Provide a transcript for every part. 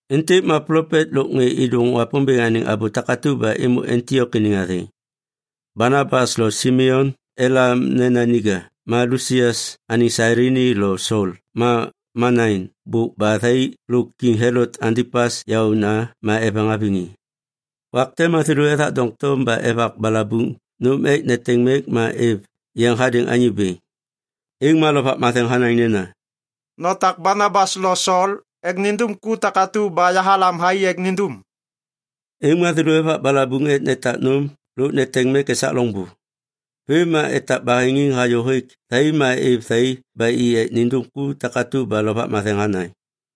Êntêk ma plopet lôk ŋê êdôŋ Wapômbêŋ anêŋ abô takatu ba êmô Antiok iniŋ athêŋ: Banabas lo Simeon elam nena Niga ma Lusius anêŋ Sailini lo Sol ma Manain bôk ba thai lôk Kiŋ Helot Antipas yaôna ma eveŋ haviŋ i. Wak te ma thêlô ethak doŋtom ba evak balabuŋ nôm ek neteŋ mek ma êv yeŋ hadêŋ Anyô Bêŋ. Êŋ ma Lovak Matheŋ hanaŋ nena, “Notak Banabas lo Sol ek nindum ku takatu ba yahalam thai ek nindum.” Êŋ ma thêlô evak balabuŋ ek netak nôm lôk neteŋ mek esak loŋbô. Vêm ma etak baheŋiŋ hayô hêk thai ma êv thai ba i ek nindum ku takatu ba Lovak Matheŋ hanaŋ.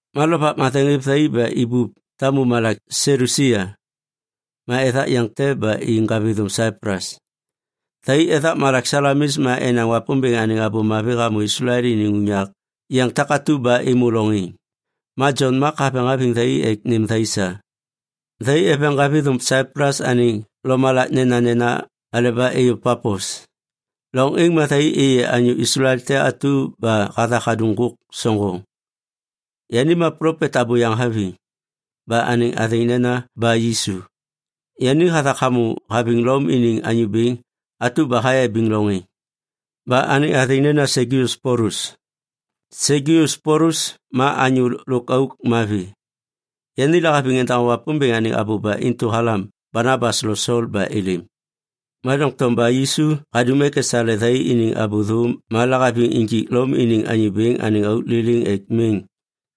Ma Lovak Matheŋ hêv thai ba i ibup tamu malak Selusia, ma ethak yeŋ te ba i ŋgavithôm Saiplus. Thai ethak malak Salamis ma enaŋ Wapômbêŋ anêŋ Abô Mavi hamô Islael iniŋ unyak yeŋ takatu ba êmô loŋ êŋ. Ma Jon Mak haveŋ haviŋ thai ek nêm thai sa. Thai eveŋ ŋgavithôm Saiplus anêŋ lomalak nenanena aleba êyô Papos. Loŋ êŋ ma thai êyê anyô Islael te atu ba hathak hadum ŋgôk soŋgoŋ. Yani ma plopet abôyaŋ haviŋ. Ba anêŋ athêŋ nena Ba-Yisu. Yani hathak hamô haviŋ Lom iniŋ anyô bêŋ atu ba hayabiŋ loŋ êŋ, ba anêŋ athêŋ nena Segius Polus. Segius Polus ma anyô lôk auk mavi. Yani lahaviŋ endaŋô Wapômbêŋ anêŋ abô ba intu halam Banabas lo Sol ba êlêm. Ma doŋtom Ba-Yisu hadum ek esale thai iniŋ abô thô ma lahaviŋ injik Lom iniŋ anyô bêŋ anêŋ auk liliŋ ek miŋ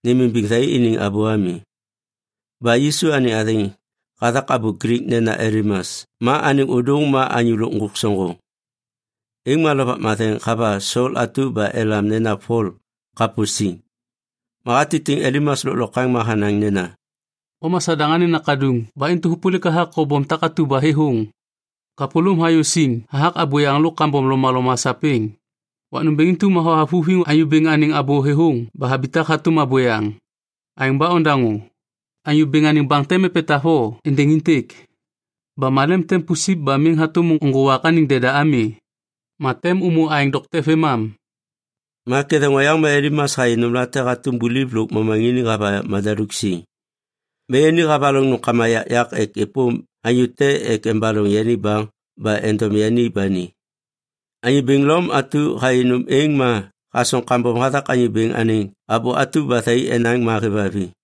nêmimbiŋ thai iniŋ abô ami. (Ba-Yisu anêŋ athêŋ hathak abô Glik nena Elimas ma anêŋ ôdôŋ ma anyô lôk ŋgôk soŋgoŋ.) Êŋ ma Lovak Matheŋ hava Sol atu ba elam nena Pol kapô siŋ, ma hatitiŋ Elimas lôklokwaŋ ma hanaŋ nena, “O ma Sadaŋ anêŋ nakaduŋ ba intu hôpôlik hathak kobom takatu ba thêthôŋ! Kapôlôm hayô siŋ hathak abôyaŋ lôk kambom lomaloma sapêŋ. Wak nômbêŋ intu ma hothavuthiŋ Anyô Bêŋ anêŋ abô thêthôŋ ba habitak hatôm abôyaŋ. Aêŋ ba ondaŋô! Anyô Bêŋ anêŋ baŋ tem epetav o êndêŋ êntêk. Ba malem tem pusip ba miŋ hatôm nôŋgô wak anêŋ deda ami ma tem ômô aêŋ dokte vêmam.” Ma ketheŋ oyaŋ ma Elimas hayê nômlate hatôm buliv lôk momaŋiniŋ hava madaluk siŋ. Ma yani havaloŋ nômkama yakyak ek êpôm anyô te ek embaloŋ yani baŋ ba endom yani ba ni. Anyô bêŋ Lom atu hayê nôm êŋ ma hasoŋ kambom hathak Anyô Bêŋ anêŋ abô atu ba thai enaŋ ma hêvhaviŋ.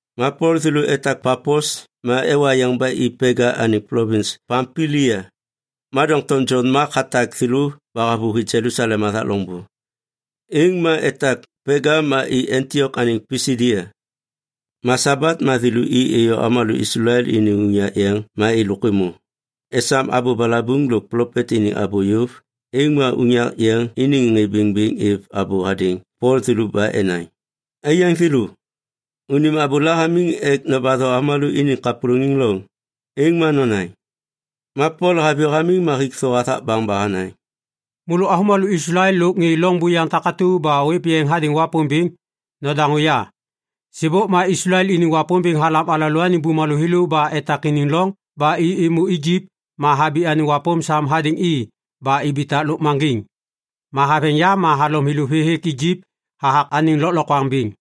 Ma Pol thêlô etak Papos ma ewa yeŋ ba i Pega anêŋ plovins Pampilia. Ma doŋtom Jon Mak hatak thêlô ba havôhi Jelusalem hathak loŋbô. Êŋ ma etak Pega ma i Antiok anêŋ Pisidia. Ma Sabat ma thêlô i êyô avômalô Islael iniŋ unyak yeŋ ma êlôk êmô. Esam abô balabuŋ lôk plopet iniŋ abô yôv, êŋ ma unyak yeŋ iniŋ ŋê bêŋ êv abô hadêŋ Pol thêlô ba enaŋ, “Aiyaŋ thêlô, unim abôla hamiŋ ek nobatho avômalô iniŋ kapôlôŋiŋ loŋ, êŋ ma nonaŋ.” Ma Pol haviyô hamiŋ ma hik thô hathak baŋ ba hanaŋ, “Môlô avômalô Islael lôk ŋê loŋ buyaŋ takatu ba ôêv yeŋ hadêŋ Wapômbêŋ, nodaŋô ya! Sêbôk ma Islael iniŋ Wapômbêŋ halam alalôaniŋ bumalô thêlô ba etak iniŋ loŋ ba i êmô Ijip ma habi anêŋ wapôm sam hadêŋ i ba ibitak lôkmaŋgiŋ. Ma haveŋ yam ma halom thêlô vê hêk Ijip hathak anêŋ lôklokwaŋ bêŋ.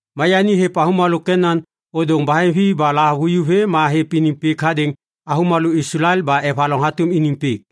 Ma yani hêv avômalô Kenan ôdôŋ baheŋvi ba lahavuju vê ma hêv iniŋ pik hadêŋ avômalô Islael ba evaloŋ hatôm iniŋ pik.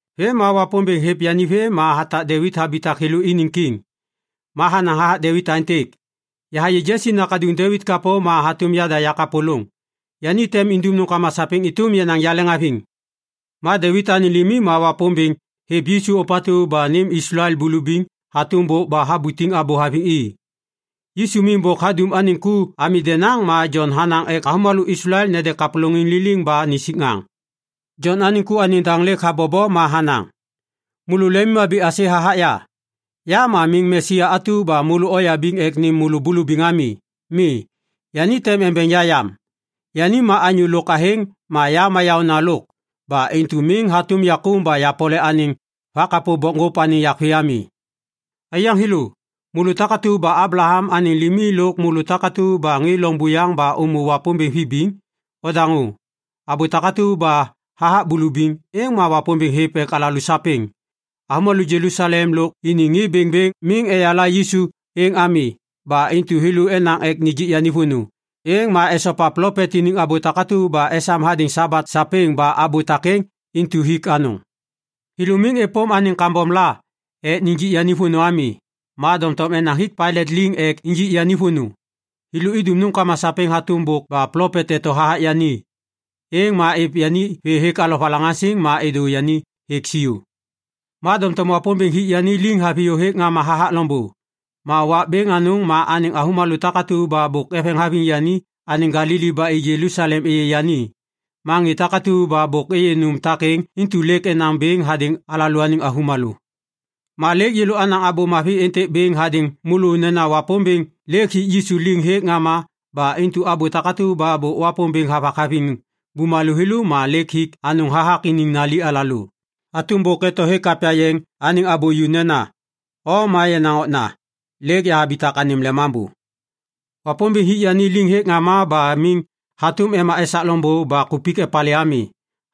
Vêm ma Wapômbêŋ hêv yani vê ma hatak Devit habitak thêlô iniŋ kiŋ. Ma hanaŋ hathak Devit aêntêk, ‘Yahayê Jesi nakaduŋ Devit kapô ma hatôm yada yakapôlôŋ. Yani tem indum nômkama sapêŋ êtôm yenaŋ yaleŋhaviŋ.’ “Ma Devit anêŋ limi ma Wapômbêŋ hêv Yisu ôpatu ba nêm Islael bulubiŋ hatôm bôk ba habutiŋ abô haviŋ i. Yisu miŋ bôk hadum anêŋ ku ami denaŋ ma Jon hanaŋ ek avômalô Islael nede kapôlôŋiŋ liliŋ ba nisik ŋaŋ. Jon anêŋ ku anêŋ daŋ lêk habobo ma hanaŋ, ‘Môlô lemimhabi aisê hathak ya? Ya ma miŋ Mesia atu ba môlô oyabiŋ ek nêm môlô bulubiŋ ami. Mi, yani tem embeŋ ya yam. Yani ma anyô lôk athêŋ ma ya ma yaônalôk ba intu miŋ hatôm yakôm ba yapole anêŋ vakapô bokŋgôp anêŋ yak vê ami.’ “Aiyaŋ thêlô, môlô takatu ba Ablaham anêŋ limi lôk môlô takatu ba ŋê loŋ buyaŋ ba ômô Wapômbêŋ vibiŋ, odaŋô. Abô takatu ba hathak bulubiŋ, êŋ ma Wapômbêŋ hêv ek alalô sapêŋ. Avômalô Jelusalem lôk iniŋ ŋê bêŋbêŋ miŋ eyala Yisu êŋ ami. Ba intu thêlô enaŋ ek nijik yani vônô, êŋ ma esopa plopet iniŋ abô takatu ba esam hadêŋ Sabat sapêŋ ba abô takêŋ intu hik anôŋ. Thêlô miŋ êpôm anêŋ kambom la ek nijik yani vônô ami, ma doŋtom enaŋ hik Pailat liŋ ek injik yani vônô. Thêlô idum nômkama sapêŋ hatôm bôk ba plopet eto hathak yani, êŋ ma êv yani vê hêk alovalaŋaŋsiŋ ma êdô yani hêk siô. Ma doŋtom Wapômbêŋ hik yani liŋ haviyô hêk ŋama hathak loŋbô, ma wak bêŋ anôŋ ma anêŋ avômalô takatu ba bôk eveŋ haviŋ yani anêŋ Galili ba i Jelusalem êyê yani. Ma ŋê takatu ba bôk êyê nôm takêŋ intu lêk enaŋ bêŋ hadêŋ alalôaniŋ avômalô. “Ma lêk yêlô anaŋ Abô Mavi êntêk bêŋ hadêŋ môlô nena Wapômbêŋ lêk hik Yisu liŋ hêk ŋama ba intu abô takatu ba Wapômbêŋ bôk havak haviŋ bumalô thêlô ma lêk hik anôŋ hathak iniŋ nali alalô. Hatôm bôk eto hêk Kapya Yeŋ anêŋ abô ju nena, “‘O ma yenaŋ Okna, lêk yahabitak anêm Lemambô.’ “Wapômbêŋ hik yani liŋ hêk ŋama ba miŋ hatôm ema esak loŋbô ba kupik epalê ami.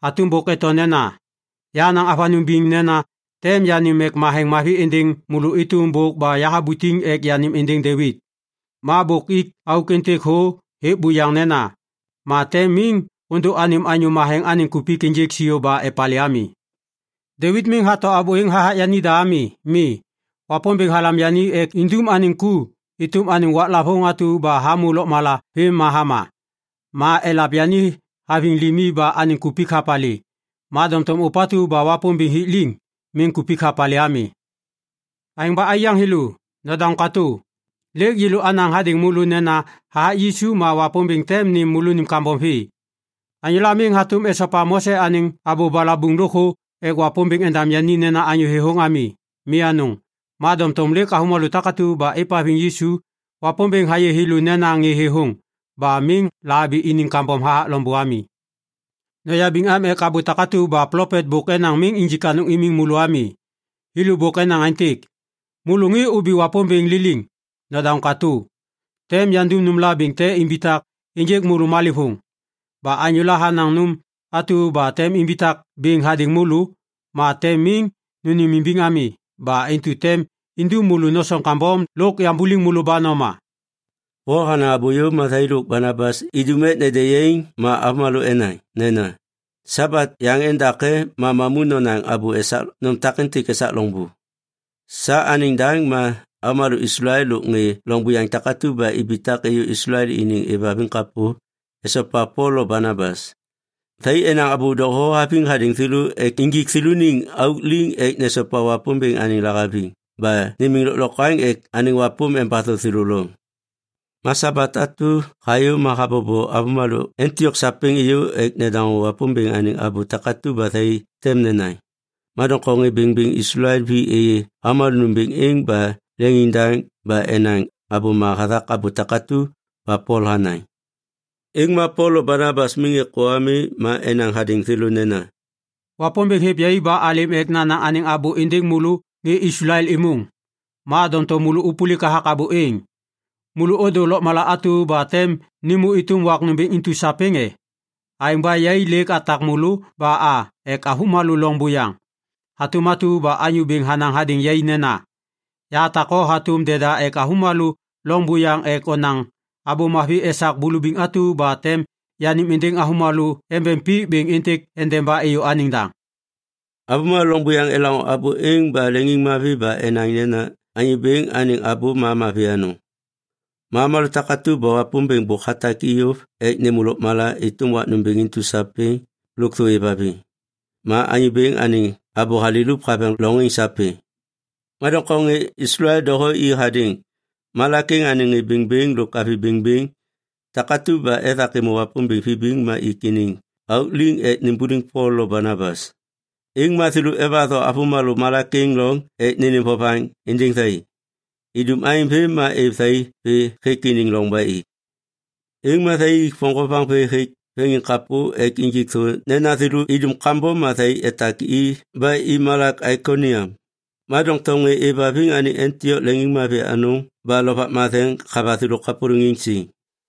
Hatôm bôk eto nena, “‘Yahanaŋ avanôŋ biŋ nena tem yanêm mek matheŋ mavi êndêŋ môlô êtôm bôk ba yahabutiŋ ek yanêm êndêŋ Devit.’ “Ma bôk ik auk êntêk thô hêk buyaŋ nena, “‘Ma tem miŋ ôdô anêm Anyô Matheŋ anêŋ kupik ênjêk siô ba epalê ami.’ “Devit miŋ hato abô êŋ hathak yanida ami. Mi, Wapômbêŋ halam yani ek indum anêŋ ku êtôm anêŋ waklavôŋ atu ba hamô lôkmala vêm ma hama. Ma elav yani haviŋ limi ba anêŋ kupik hapalê. Ma doŋtom ôpatu ba Wapômbêŋ hik liŋ, miŋ kupik hapalê ami. “Aêŋ ba aiyaŋ thêlô, nodaŋô katô. Lêk yêlô anaŋ hadêŋ môlô nena hathak Yisu ma Wapômbêŋ tem nêm môlônim kambom vê. Anyôla miŋ hatôm esopa Mose anêŋ abô balabuŋ lôkthô ek Wapômbêŋ endam yani nena anyô thêthôŋ ami. Mi anôŋ, ma doŋtom lêk avômalô takatu ba êvhaviŋ Yisu, Wapômbêŋ hayê thêlô nena ŋê thêthôŋ ba miŋ lahabi iniŋ kambom hathak loŋbô ami. Noyabiŋ am ek abô takatu ba plopet bôk enaŋ miŋ injik anôŋ imiŋ môlô ami. Thêlô bôk enaŋ aêntêk, “‘Môlô ŋê obi Wapômbêŋ liliŋ, nodaŋô katô! Tem yandum nômla bêŋ te imbitak ênjêk môlô malêvôŋ. Ba anyôla hanaŋ nôm atu ba tem imbitak bêŋ hadêŋ môlô, ma tem miŋ nônêmimbiŋ ami. Ba intu tem indum môlô nosoŋ kambom lôk yambuliŋ môlô ba noma.’” Pol hanaŋ abô yôv ma thai lôk Banabas idum ek nede yaiŋ ma avômalô enaŋ nena, “Sabat yaŋ endake ma mamu nonaŋ abô esak nôm takêntêk esak loŋbô.” Sa anêŋ daŋ ma avômalô Islael lôk ŋê loŋ buyaŋ takatu ba ibitak êyô Islael iniŋ êvhaviŋ kapô esopa Pol lo Banabas. Thai enaŋ abô doho haviŋ hadêŋ thêlô ek injik thêlôniŋ auk liŋ ek nesopa Wapômbêŋ anêŋ lahaviŋ ba nimiŋ lôklokwaŋ ek anêŋ wapôm embatho thêlô loŋ. Ma Sabat atu hayô ma habobo avômalô Antiok sapêŋ êyô ek nedaŋô Wapômbêŋ anêŋ abô takatu ba thai tem nenaŋ. Ma doŋtom ŋê bêŋbêŋ Islael vi êyê avômalô nômbêŋ êŋ ba leŋiŋdaŋ ba enaŋ abôma hathak abô takatu ba Pol hanaŋ. Êŋ ma Pol lo Banabas miŋ êkô ami ma enaŋ hadêŋ thêlô nena, “Wapômbêŋ hêv yai ba alêm ek nanaŋ anêŋ abô êndêŋ môlô ŋê Islael êmôŋ. Ma doŋtom môlô ôpôlik hathak abô êŋ. Môlô ôdô lôkmala atu ba tem nêmô êtôm wak nômbêŋ intu sapêŋ e? Aêŋ ba yai lêk atak môlô ba a ek avômalô loŋ buyaŋ. Hatôm atu ba Anyô Bêŋ hanaŋ hadêŋ yai nena, “‘Yahatak o hatôm deda ek avômalô loŋ buyaŋ ek onaŋ Abô Mavi esak bulubiŋ atu ba tem yanêm êndêŋ avômalô embeŋ pik bêŋ êntêk endeba êyô anêŋ daŋ.’” Avômalô loŋ buyaŋ elaŋô abô êŋ ba leŋiŋmavi ba enaŋ nena Anyô Bêŋ anêŋ abô ma mavi anôŋ. Ma avômalô takatu ba Wapômbêŋ bôk hatak i yôv ek nêmô lôkmala êtôm wak nômbêŋ intu sapêŋ, lôkthô êvhaviŋ. Ma Anyô Bêŋ anêŋ abô halilup haveŋ loŋ êŋ sapêŋ. Ma doŋtom ŋê Islael doho i hadêŋ malak êŋ anêŋ ŋê bêŋbêŋ lôk avi bêŋbêŋ takatu ba ethak êmô Wapômbêŋ vibiŋ ma ik iniŋ auk liŋ ek nimbuliŋ Pol lo Banabas. Êŋ ma thêlô evatho avômalô malak êŋ loŋ ek nênêm vovaŋ êndêŋ thai. Idum aêŋ vêm ma êv thai vê hêk iniŋ loŋ ba i. Êŋ ma thai ik voŋgovaŋ vê hêk veŋiŋkapô ek injik thô nena thêlô idum kambom ma thai etak i ba i malak Aikoniam. Ma doŋtom ŋê êvhaviŋ anêŋ Antiok leŋiŋmavi anôŋ ba Lovak Matheŋ hava thêlô kapôlôŋiŋ siŋ.